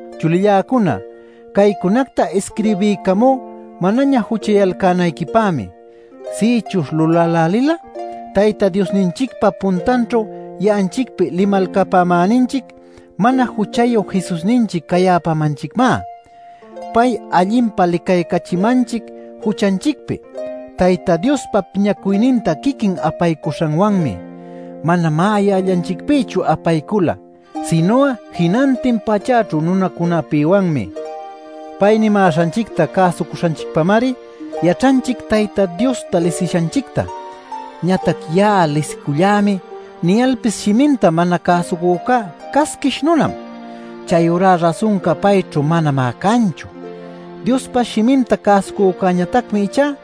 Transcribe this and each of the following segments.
Chulilläcuna, caycunacta isquirbiycamú manaña juchayalcänayquipämi. Sïchuśh lulälälil'a, Tayta Diosninchicpa puntanćhu ya'anchicpi limalcapämäninchic mana juchayu Jesusninchic cayäpamanchicmá. Pay allinpa licaycachimanchic juchanchicpi Tayta Diospa piñacuyninta quiquin apaycuśhanwanmi. Manamá ya'allanchicpïchu apaycula sinu'a jinantin pachäćhu nunacunapïwanmi. Pay nimäśhanchicta cäsucuśhanchicpamari yaćhanchic Tayta Diosta lisishanchicta. Ñatac “Ya'a lisicullämi” niyalpis shiminta mana cäsucücá casquish nunam. Chayurá rasunca payćhu manamá canchu. Diospa shiminta cäsucücätañatacmi ichá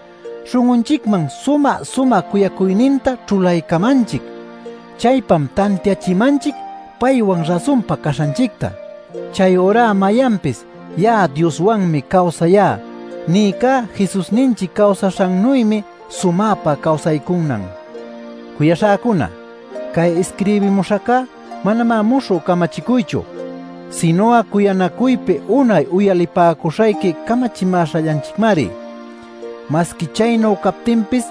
śhun'unchicman sumä-sumä cuyacuyninta ćhulaycamanchic. Chaypam tantiachimanchic paywan rasunpa caśhanchicta. Chayurá mayanpis “Ya'a Dioswanmi cawsayá” nïcá Jesusninchic cawsaśhannuymi sumäpa cawsaycunan. Cuyaśhäcuna, cay isquirbimuśhäca manamá muśhü camachicuychu, sinu'a cuyanacuypi unay uyalipäcuśhayqui camachimäśhallanchicmari. Masqui chaynu captinpis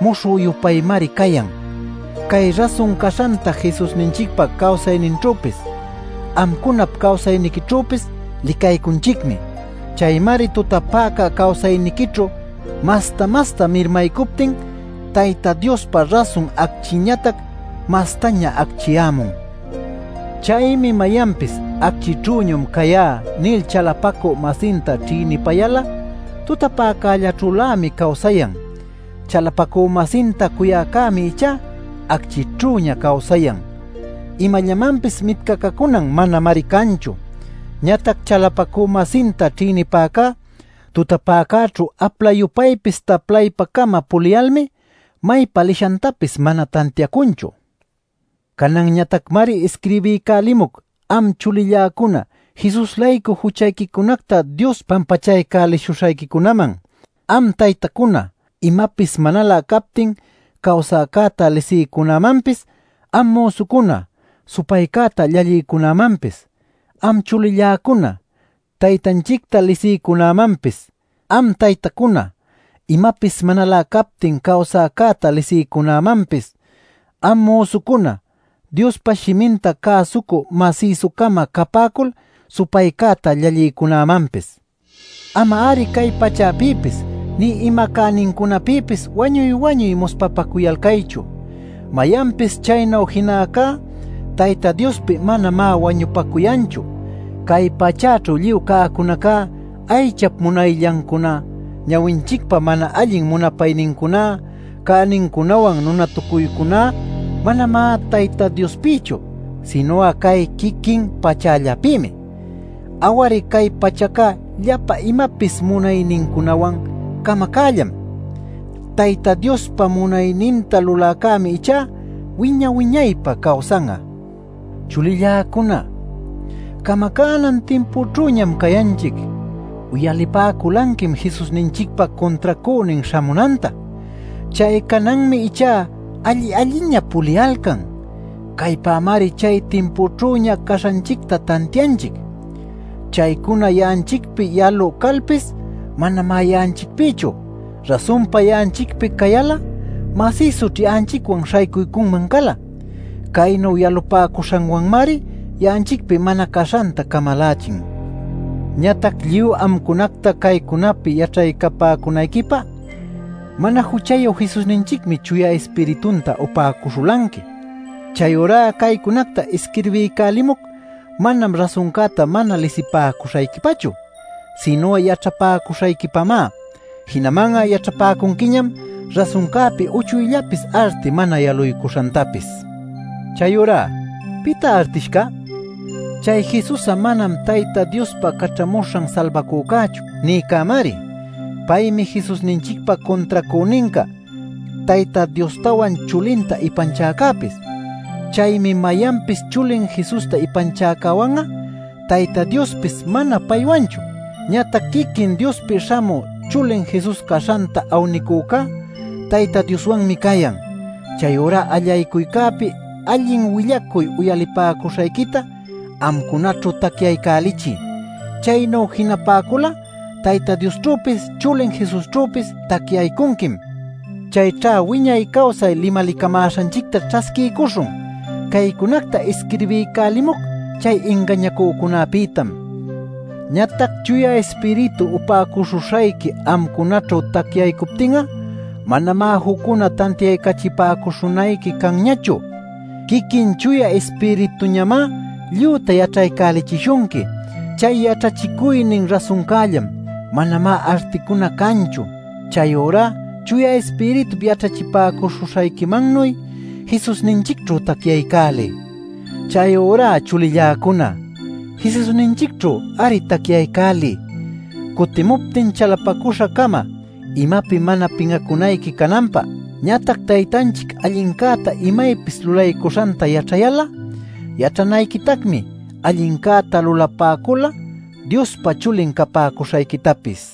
muśhü-yupaymari cayan. Cay rasun caśhanta Jesusninchicpa cawsayninćhüpis amcunap cawsayniquićhüpis licaycunchicmi. Chaymari tutapäca cawsayniquićhu masta-masta mirmaycuptin Tayta Diospa rasun acchinñatac mastaña acchiyämun. Chaymi mayanpis “Acchïćhüñam cayá” nil chalapacü-masinta ćhïnipayal'a tutapäcällaćhülämi cawsayan. Chalapacü-masinta cuyäcämi ichá acchïćhüña cawsayan. Imallamanpis mitcacacunan manamari canchu. Ñatac chalapacü-masinta ćhïnipäcá tutapäcäćhu apla-yupaypis taplaypa-cama puliyalmi maypa lishantapis mana tantiacunchu. Cananñatacmari isquirbiycälimuc, am chulilläcuna, Jesus-laycu juchayquicunacta Dios pampachaycälishuśhayquicunäman, am taytacuna, imapis manalä captin cawsäcäta lisïcunämanpis, am müsucuna, supaycäta llallïcunämanpis, am chulilläcuna, Taytanchicta lisïcunämanpis, am taytacuna, imapis manalä captin cawsäcäta lisïcunämanpis, am müsucuna Diospa shiminta cäsucü masïsu-cama capäcul supaycäta llallïcunämanpis. Ama-ari cay pachäpïpis nï ima cänincunapïpis wañuy-wañuy muspapacuyalcaychu. Mayanpis chaynu jinäcá Tayta Diospi manamá wañupacuyanchu. Cay pachäćhu lluy cäcunaca - aychap munayllancuná, ñawinchicpa mana allin munapaynincuná, cänincunawan nunatucuycuná - manamá Tayta Diospïchu, sinu'a cay quiquin pachällapïmi. Aw-ari, cay pachaca llapa imapis munaynincunawan camacällam. Tayta Diospa munayninta luläcämi ichá wiña-wiñaypä cawsan'a. Chulilläcuna, camacänan timpućhüñam cayanchic. Uyalipäculanquim Jesusninchicpa cuntracünin śhamunanta. Chay cananmi ichá alli-alliña puliyalcan. Caypamari chay timpućhüña caśhanchicta tantianchic. Chaycuna ya'anchicpi yalü calpis, manamá ya'anchicpïchu. Rasunpa ya'anchicpi cayal'a masïsućh ya'anchicwan śhaycuycunman cala. Caynu yalupäcuśhanwanmari ya'anchicpi mana caśhanta camalachin. Ñatac lluy amcunactá caycunapi yaćhapäcunayquipä mana juchayu Jesusninchicmi Chuya Ispiritunta upäcuśhulanqui. Chayurá caycunacta isquirbiycälimuc manam rasuncäta mana lisipäcuśhayquipachu, sinu'a yaćhapäcuśhayquipamá. Jinaman'a yaćhapäcunquiñam rasuncäpi uchuyllapis arti mana yaluycuśhantapis. Chayurá ¿pitá artishca? Chay “Jesus'a manam Tayta Diospa Caćhamuśhan Salbacücächu” nïcämari. Paymi Jesusninchicpa cuntracüninca, Tayta Diostawan chulinta ipanchäcäpis. Chaymi mayanpis chulin Jesusta ipanchäcäwan'a, Tayta Diospis mana paywanchu. Ñatac quiquin Diospi śhamü chulin Jesus caśhanta awnïcunacá Tayta Dioswanmi cayan. Chayurá allaycuycäpi allin willacuy uyalipäcuśhayquita amcunaćhu tacyaycälichiy. Chaynu jinapäcul'a Tayta Diosćhüpis chulin Jesusćhüpis tacyaycunquim. Chayćha wiñay cawsay limalicamäśhanchicta ćhasquiycuśhun. Caycunacta isquirbiycälimuc chay ingañacücunäpïtam. Ñatac Chuya Ispiritu upäcuśhuśhayqui amcunaćhu tacyaycuptin'a manamá juccuna tantiaycaćhachipäcuśhunayqui canñachu. Quiquin Chuya Ispirituñamá lluyta yaćhaycälichishunqui. Chay yaćhachicuynin rasuncällam; manamá articuna canchu. Chayurá Chuya Ispiritu yaćhachipäcuśhuśhayquimannuy Jesusninchicćhu tacyaycäliy. Chayurá chulilläcuna, Jesusninchicćhu-ari tacyaycäliy, cutimuptin chalapacüśha-cama imapi mana pin'acunayqui cananpä. Ñatac Taytanchic allincäta imaypis lulaycuśhanta yaćhayal'a, yaćhanayquitacmi allincäta lulapäcul'a Diospa chulin capäcuśhayquitapis.